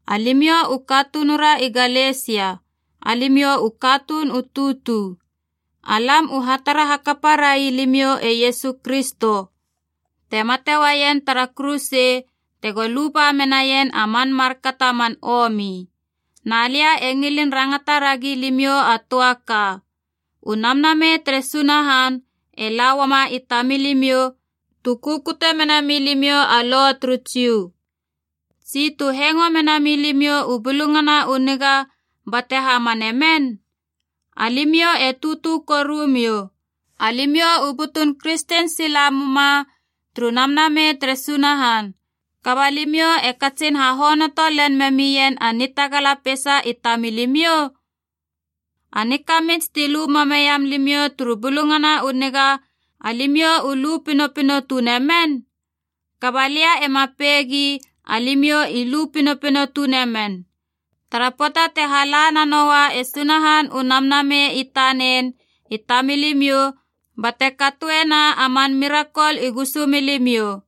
Alimiou u katunura i Galesia alimiou u katuun u tutu. Alam u hatara hakapa rai limiou e Iesu Kristo, te mate uaien tara kuruse tego luba menaien a man markato a man omi. Na lia e ngilin rangata ragi limiou a töa ka: u Namnamei tere Sunahan e la uama i tamilimiou tu kukute mena milimiou a Lo turu Jiu, tsi tu hengo mena milimiou u Bulungana u Niga bate hamane men? Alimiou e tutu korumiou! Alimiou u butun kristen sila muma turu Namnamei tere Sunahan. Kaba limiou e katsin hahonoto len memien a nitagala peisa i tamilimiou? A nikamits ti lu mameiam limiou turu Bulungana u Niga, alimiou u lu pinopino tune men? Kaba lia ema peigi alimiou i lu pinopino tune men. Tara pöata te hala nanoua e Sunahan u Namnamei i tanen i tamilimiou, bate katoena a man mirakol i gusumilimiou,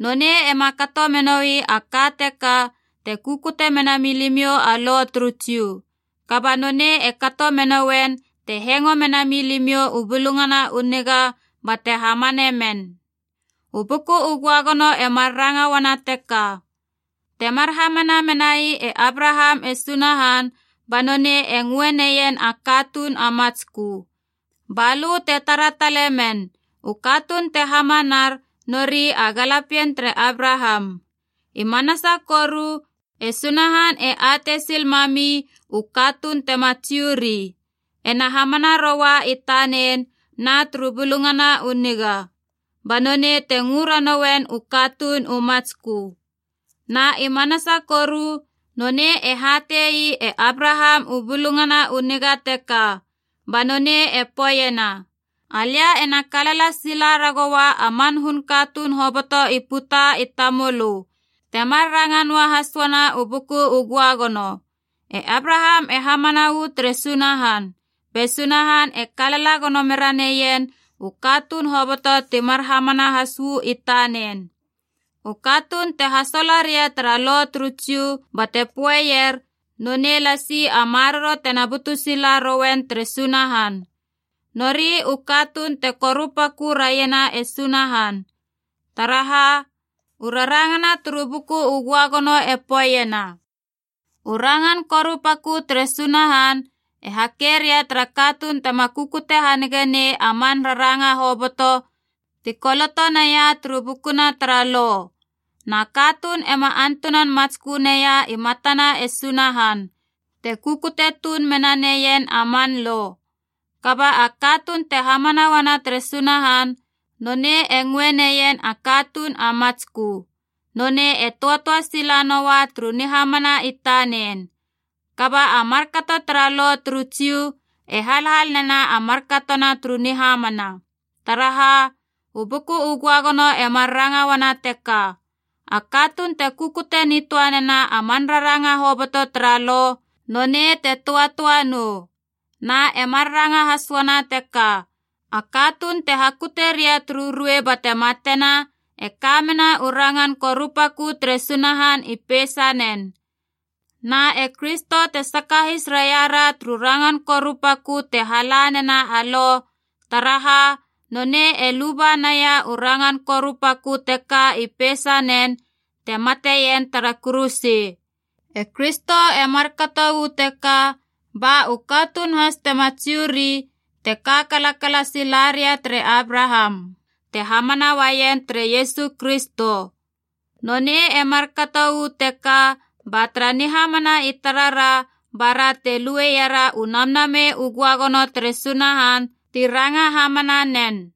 nonei ema kato menoi a ka teka te kukute mena milimiou a Lo turu Jiu. Kaba nonei e kato menoien te hengo menami limiou u Bulungana u Niga bate hamane men. U Buku u Göagono e mar ranga uana teka: Temar hamana menai e Abraham e Sunahan, ba nonei e ngö neien a katuun a matskö. Ba lö te tara talemen, u katuun te hamanar nori a galapien tere Abraham. I manasa koru e Sunahan e atei sil mami u katuun tema Jiu ri, ena hamana roua i tanen na turu Bulungana u Niga. Ba nonei te ngö ranoien u katuun u matskö. Na i manasa koru nonei e hate ii e Abraham u Bulungana u Niga teka. Ba nonei e poeiena, “Alia ena kalala sila ragoua a man hun katuun hoboto i puta i tamölö.” Temar ranga noahas uana u Buku u Göagono. E Abraham e hamana uu tere Sunahan, be Sunahan e kalala gono mera neien u katuun hoboto timar hamana has uu i tanen. U katuun te hasola ria tara Lo turu Jiu bate poeier nonei lasi a maroro tena butu sila roien tere Sunahan, nori u katuun te korupakö raiena e Sunahan. Taraha, u rarangana turu Buku u Göagono e poeiena, “U rangan korupakö tere Sunahan e hake ria tara katuun tema kukute hanige nei a man raranga hoboto ti koloto naia turu bukuna tara Lo.” Na katuun ema antunan matskö neia i matana e Sunahan te kukute tuun mena neien a man Lo. Kaba a katuun te hamana uana tere Sunahan nonei e ngöe neien a katuun a matskö, nonei e töatöa sila noua turu nihamana i tanen. Kaba a markato tara Lo turu Jiu e halhal nena markatona turu nihamana. Taraha, u Buku u Göagono e mar ranga uana teka, “A katuun te kukute nitöa nena a man raranga hoboto tara Lo nonei te töatöa nou.” Na e mar ranga has uana teka, “A katuun te hakute ria turu ruei bate matena e ka mena u rangan korupakö tere Sunahan i peisanen.” Na e Kristo te sakahis raiara turu rangan korupakö te hala nena a Lo, taraha nonei e luba naia u rangan korupakö teka i peisanen te mate ien tara kuruse. E Kristo e markato uu teka ba u katuun has tema Jiu ri te kalala sila raria tere Abraham ti hamana uaien tere Iesu Kristo. Nonei e markato uu teka ba tara nihamana i tarara bara e luera u Namnamei u Göagono tere Sunahan ti ranga hamana nen.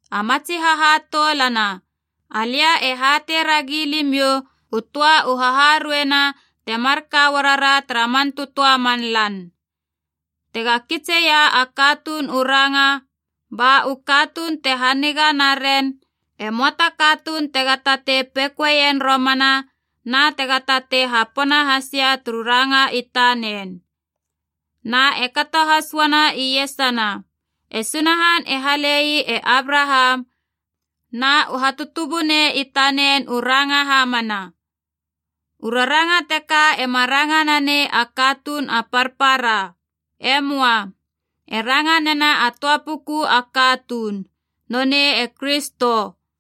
A matsi hahatoulana, alia e hatei ragi limiou u töa u haharueina temar ka uarara tara man tötöa man lan. Tega kitseia a katuun u ranga, ba u katuun te haniga naren, e möa ta katuun tega tatei pekoeien romana na tega tatei hapona hasia turu ranga i tanen. Na e kato has uana iesana, e Sunahan e hale ii e Abraham na u hatutubunei i tanen u ranga hamana. U raranga teka ema ranga nanei a katuun a parpara. E möa. E ranga nena a töa puku a katuun, nonei e Kristo.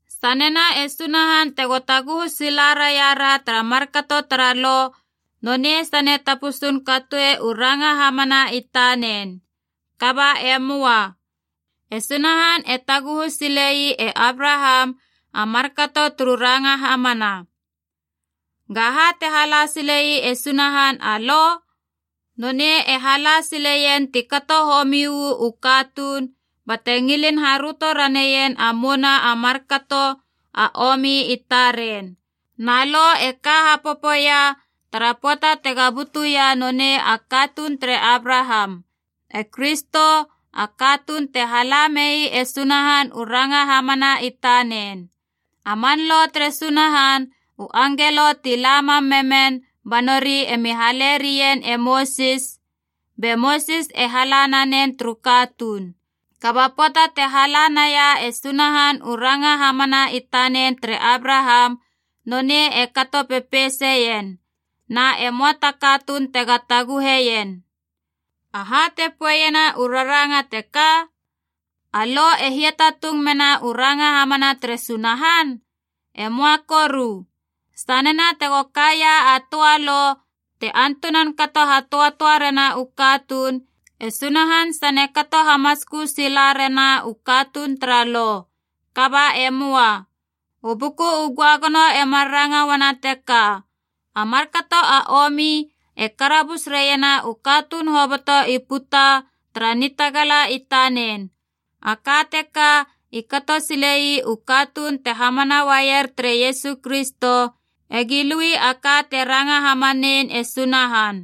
Sanena e Sunahan tega taguhu sila raia ra tara markato tara Lo, nonei sane tapusun katoi u ranga hamana i tanen. Kaba e möa. E Sunahan e taguhu sile ii e Abraham a markato turu ranga hamana. Gaha te hala sile ii e Sunahan a Lo? Nonei e hala sileien ti kato homi uu katuun bate ngilin haröto raneien a mouna a markato a omi i taren. Na Lo e ka hapopoia tara pöata tega butuia nonei a katuun tere Abraham, e Kristo, a katuun te hala mei e Sunahan u ranga hamana i tanen. A man Lo tere Sunahan u angelo ti la mam memen ba nori emi hale rien e Mosis be Mosis e hala nanen turu katuun. Kaba pöata te hala naia e Sunahan u ranga hamana i tanen tere Abraham, nonei e kato pepeiseien, na e möa ta katuun tega taguheien. Aha te poeiena u raranga teka? A Lo e hiatatung mena u ranga hamana tere Sunahan? E möa koru! Sanena tego kaia a töa lo te antunan kato hatöatöa rena u katuun, e Sunahan sane kato hamatskö sila rana u katuun tara Lo. Kaba e möa. U Buku u Göagono e mar ranga uana teka, a markato a omi e karabus raiena u katuun hoboto i puta tara nitagala i tanen. A ka teka i kato sile ii u katuun te hamana uaier tere Iesu Kristo egi lui a ka te ranga hamanein e Sunahan.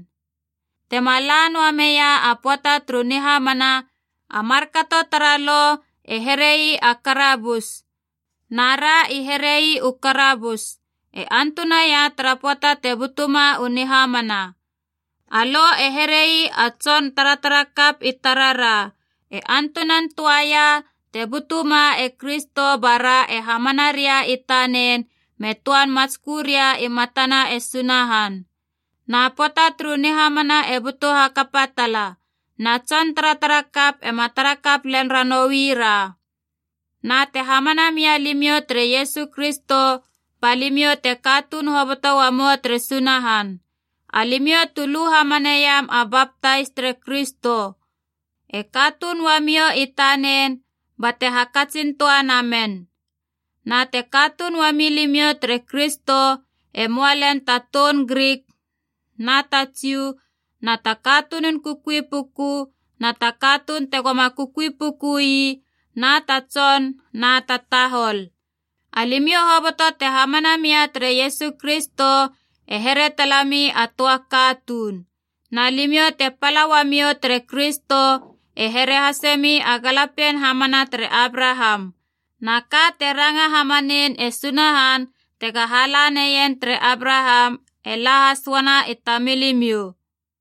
Temaala noa meia a pöata turu nihamana, a markato tara Lo e here ii a karabus nara i herei u karabus, e antunaia tara pöata te butuma u nihamana. A Lo e here ii a tson taratara kap i tarara, e antunan töaia te butuma e Kristo bara e hamana reia i tanen me töan matskö raia i matana e Sunahan. Na pöata turu nihamana e butu hakapa tala, na tson taratara kap ema tarakap lel ranoui ra. Na te hamana mia limiou tere Iesu Kristo, ba limiou te katuun hoboto uamou tere Sunahan. Alimiou tu lu hamaneiam a baptais tere Kristo, e katuun uamiou i tanen bate hakatsin töa namen. Na te katuun uami limiou tere Kristo, e möa lel ta toun Grik na ta Jiu, na ta katunun kukui puku na ta katuun tegoma kukui puku ii, na ta tson na ta tahol. Alimiou hoboto te hamana mia tere Iesu Kristo e here talemi a töa katuun. Na limiou te pala uamiou tere Kristo e here hasemi a galapien hamana tere Abraham, na ka te ranga hamanein e Sunahan tega hala naien tere Abraham e la has uana i tamilimiou.